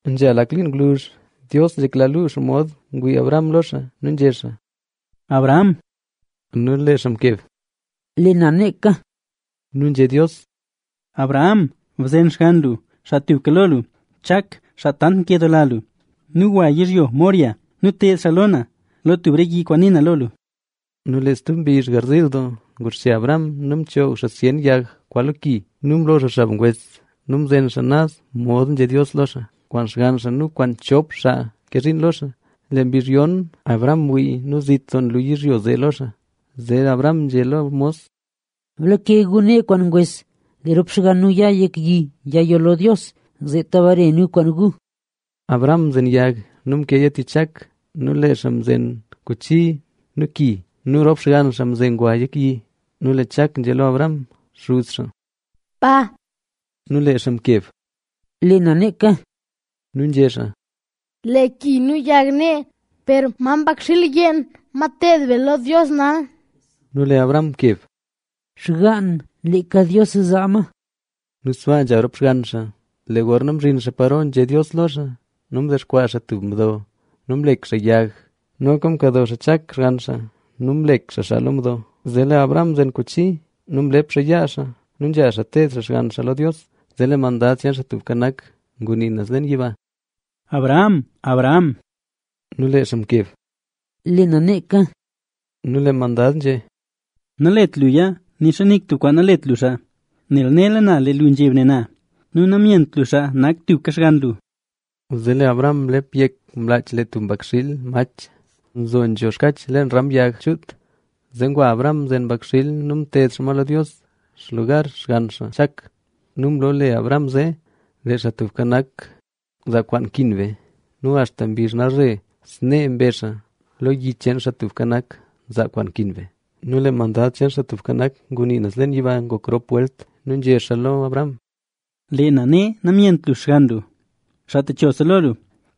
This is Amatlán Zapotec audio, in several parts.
Nzha lak liin ngwluzh, Dios nzhekla luu xomod ngwii Abraham lo xaa, nu nzhé xaa: —Abraham. Nu lee xaa mkeb: —Lee na neeka. Nu nzhé Dios: —Abraham, bzen xgann lu, xaa tuka lo lu, Chak, xaa tant nkedoola lu nu gwa yizhyo Moriah nu ted xaa lo na, lo tub re yi kwaan nii na lo lu. Nu lee stub mbizh garziil doo, nguxche Abraham nu mchoog xaa zyen yag kwaa lo ki nu mlo xaa xab ngwes nu mzen xaa naz mod nzhé Dios lo xaa, kwaan xgann xaa nu kwaan chop xaa nke zhiin lo xaa. Lee mbizh yon, Abraham mwii nu zit doo nlu yizhyo zee lo xaa. Zee lee Abraham nzhé lo mos: —Blake gu nee kwaan ngwes, lee rop xgann nu ya yek yi yayoll lo Dios, zeeta bare nu kwaan gu. Abraham mzen yag nu mkeeya tich Chak. Nu lee xaa mzen kuchi nu ki. Nu rop xgann xaa mze ngwa yek yi. Nu lee Chak nzhé lo Abraham, xuz xaa: —Pa. Nu lee xaa mkeb: —Lee na neeka. Nu nzhé xaa: —Lee ki nu yag nee, per ¿ma mbakxiil yeen, ma teed be lo Dios nal? Nu lee Abraham mkeb: —Xgaan, leeka Dios zaa ma. Nu sbaa nzha rop xgann xaa. Lee gorna mzhin xaa paro nzhé Dios lo xaa nu mdexkwaa xaa tub mdo nu mlek xaa yag. Noka mkado xaa Chak, xgann xaa nu mzhib xaa xaa lo mdo. Zee lee Abraham mzen kuchi nu mlep xaa yaa xaa nu nzha xaa teed xaa xgann xaa lo Dios. Zee lee mandad cheen Xaa Tubka Nak ngunii naz leen yiba: —¡Abraham, Abraham! Nu lee xaa mkeb: —Lee na neeka. Nu lee mandad nzhé: —Nalet luya. Nixa nik tub kwaan nalet lu lo xaa, nel nela na lee lu nzheb ne na nu namyent lu xaa nak tuka xgann lu. Zee lee Abraham mlep yek mlaach lee tub mbakxiil mach nzo nzho xkach leen ram yag. Zee ngwa Abraham mzen mbakxiil nu mted xaa ma lo Dios xlugar xgann xaa Chak. Nu mloole Abraham zee: “Lee Xaa Tubka Nak Nzaa Kwaan Nkin Be”. Nu axta mbizh nalzhe snee mbezh xaa: “Lo yi cheen Xaa Tubka Nak, nzaa kwaan nkin be”. Nu lee mandad cheen Xaa Tubka Nak ngunii naz leen yiba ngok rop welt nu nzhé xaa lo Abraham: —Lee na ne namyent lu xgann lu, xaa techose lo lu,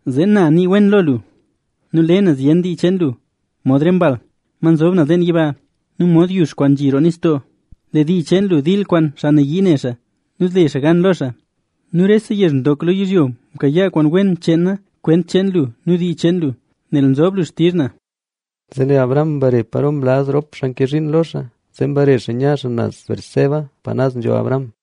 zee na nii wen lo lu nu le na zyen dii cheen lu mod re mbal, ma nzob naz leen yiba nu mod yux kwaan nzhi roo nistoo. Lee dii cheen lu dil kwaan xaa nayii ne xaa nu zle xaa gan lo xaa. Nu rese yezh ndok lo yizhyo mkayaa kwaan wen cheen na kwent cheen lu nu dii cheen lu, nel mbin lu xtizh na. Zee lee Abraham mbare paro mlaz rop xaa nke zhiin lo xaa; zee mbare xaa nya xaa naz Beerseba pa naz nzho Abraham.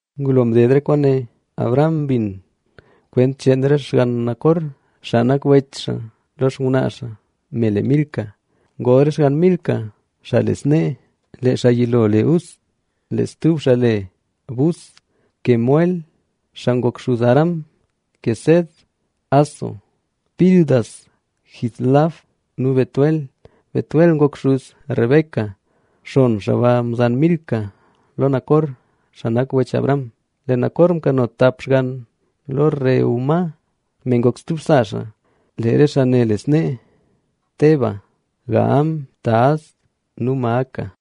Ngulo mded re kwaane, Abraham mbin kwent cheen re xgann Nacor, xaa nak wech xaa. Lo xngwnaa xaa, me le Milca, ngol re xgann Milca, xaa le snee: lee xaa yilo le Uz, lee stub xaa le Buz, Kemuel (xaa ngok xuz Aram), Quesed, Hazo, Pildas, Jidlaf nu Betuel. Betuel ngok xuz Bek. Xon xaa ba mzan Milca lo Nacor, xaa nak wech Abraham. Lee Nacor mkano tap xgann lo Reúma, me noka ngok stub sa xaa. Lee re xaa ne le snee: Teba, Gaham, Tahas nu Maaca.